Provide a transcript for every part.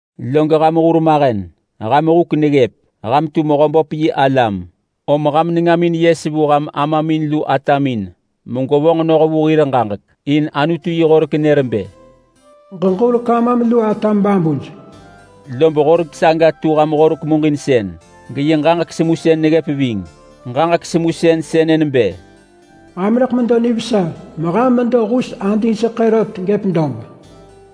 Log ham hurmahen, ham huk neggëp. Ham tu Mehöböp yi alam, om ham nengamin yes vu ham amamin lu atamin megwevonġ noh vu hir ġaġek. In Anutu yi horek nër bë, “Ġeġurek amam lu atam babuj.” Lob horek saga tu ham Horek muġinsën geyi ġaġek semusën neggëp ving. Ġaġek semusën sënë nebë, “Ham rëḳ medo nivesa meham medo hus adingseḳë rot gëp dob.”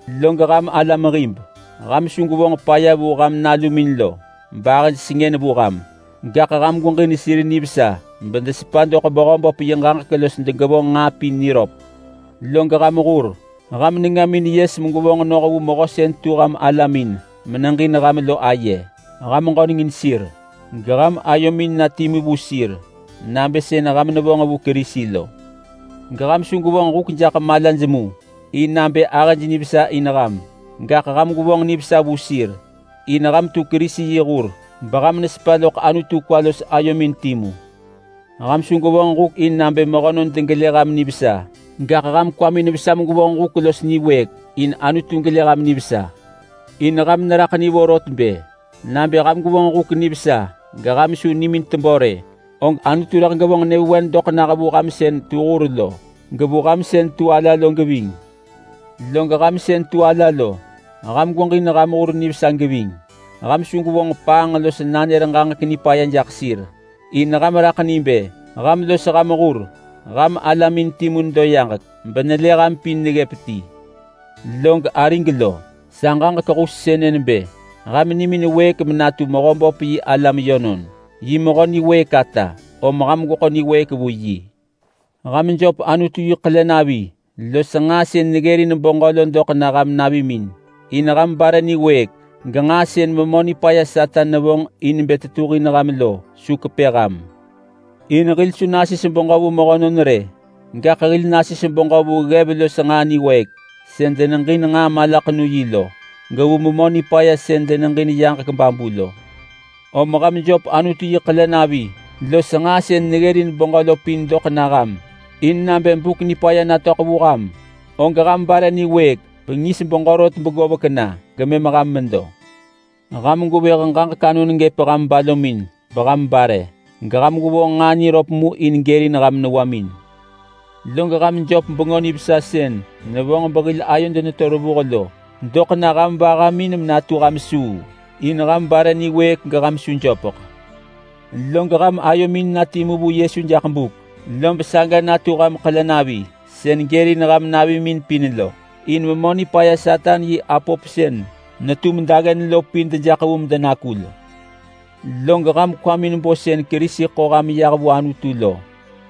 Log ham alam hib, ham su gwevonġ paya vu ham nalumin lo bahëj sengën vu ham, gaḳ ham gweġin sir nivesa bedesepa doḳ Mehöböp yi ġaġek los degevonġ nġaa pin niröp. Log ham hur, ham nengamin yes megwevonġ noh vu mehö sën tu alamin meneġin ham lo aye. Ham ġönengin sir, geham ayomin na timu vu sir nabë sën ham nevonġ vu Kerisi lo. Geham su gwevonġ huk jaḳ malaj mu in nabë ahëj nivesa in ham, gaḳ ham gwevonġ nivesa vu sir, in ham tu Kerisi yi hur beham nesepa loḳ Anutu kwa los ayomin timu. Ham su gwevonġ huk in nabë mehönon degelë ham nivesa, gaḳ ham kwamin vesa megwevonġ huk los niwëëk in Anutu gelë ham nivesa. In ham neraḳ ni vorot bë: Nabë ham gwevonġ huk nivesa geham su nimin tebö rë, og Anutu rëḳ gevonġ nyëvewen doḳ nah vu ham sën tu hur lo, gevu ham sën tu ala lo geving. Log ham sën tu ala lo, ham gweġin ham hur nivesa geving. Ham su gwevonġ paanġ los nanër ġaġek nipaya jaḳ sir, in ham raḳ ni bë ham los ham hur ham alamin timu nedo yaġek benelë ham pin neggëp ti. Log arig lo, sa ġaġek hus sënë nebë: Ham nimin wëëk menatu Mehöböp yi alam yönon! Yi mehö niwëëk ata, om ham gweḳo niwëëk vu yi. Ham jöp Anutu yi ḳelenavi los nġaa sën neggërin beġö lo doḳ na ham navimin, in ham bare niwëëk genġaa sën Memö Nipaya Satan nevonġ in bë tetuhin ham lo su kepë ham. In hil su nasis beġö vu mehönon rë, gaḳ hil nasis beġö vu ggev los nġaa niwëëk sën deneġin nġaa malaḳenu-yi lo, gevu memö nipaya sën deneġin yaġek babu lo. Om ham jöp Anutu yi ḳelenavi los nġaa sën neggërin beġö lo pin doḳ na ham, in nabë buk nipaya natöḳ vu ham, og ham bare niwëëk bengis beġö rot begovek na, gemëm ham medo. Ham gwevëh ġaġek anon gëp ham balomin beham bare. Geham gwevonġ nġaa niröp mu in gërin ham newamin. Log ham jöp Bengö Nivesa sën nevonġ behil ayod neto revuh lo doḳ na ham vahamin natu ham suu, in ham bare niwëëk geham su jöpeḳ. Log ham ayomin na timu vu Yesu jaḳ buk, lob saga natu ham ḳelenavi sën gërin ham navimin pin lo, in Memö Nipaya Satan yi apop sën netum daggen lo pin dejaḳ vu medenakul. Log ham kwamin bo sën Kerisi ḳo ham yah vu Anutu lo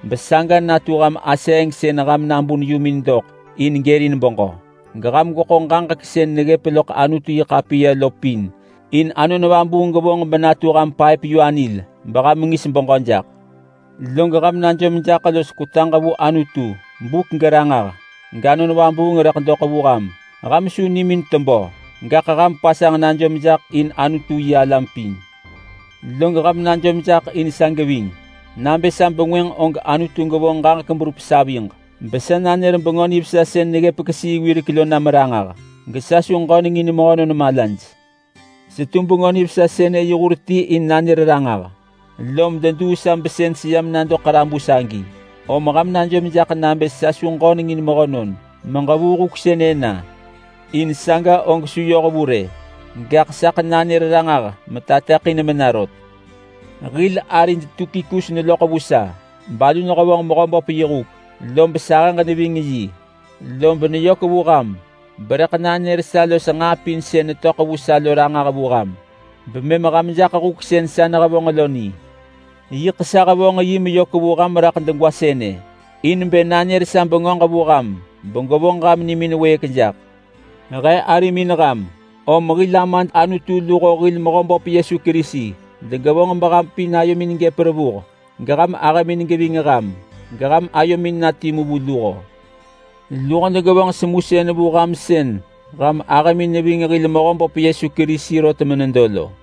besaga natu ham aseeng sën ham nabun yumin doḳ in gërin beġö. Geham gweḳo ġaġek sën neggëp loḳ Anutu-yi-ḳapiya lo pin in Anon Vabuung gevonġ benatu ham paëp-yu-anil beham ngis beġö jaḳ. Log ham najom jaḳ los kwetaġ vu Anutu buk geranġah, gAnon Vabuung rëḳ doḳ vu ham. Ham su nimin tebö! Gaḳ ham pasanġ najom jaḳ in Anutu-yi-alam pin. Log ham najom jaḳ in sa geving nabë sa bengwënġ og Anutu gevonġ ġaġek berup saviġ besa nanër Bengö Nivesa sën neggëp kesii wirek lo nam ranġah, gesa su ġönengin mehönon malaj. Setu Bengö Nivesa sënë yi hur ti in nanër ranġah, lom deduu sa besën seyam nado ḳarabus agi. Om ham najom jaḳ nabë sa su ġöneng in mehönon meġevuu huk sënë na, in saga og su yoh vu rë, gaḳ saḳ nanër ranġah metateḳin mena rot. Hil arid Tukikus neloḳ vu sa balu nehevonġ Mehöböp yi huk lob sa ahëġ neving yi. Lob neyök vu ham berëḳ nanër sa los nġaa pin sën netöḳ vu sa lo ranġah vu ham bemëm ham jaḳ huk sën sa nehevonġ lo ni. Yiḳ sa hevonġ yi meyök vu ham raḳ degwa sënë in bë nanër sa bengöġ vu ham begevonġ beham nimin wëëk jaḳ. He arimin ham, om hil Amad Anutu luho hil Mehöböp Yesu Kerisi degevonġ beham pin ayomin gëp revuh, geham ahëmin geving ham, geham ayomin na timu vu luho. Luho degevonġ semusën vu ham sën ham ahëmin neving hil Mehöböp Yesu Kerisi rot menedo lo.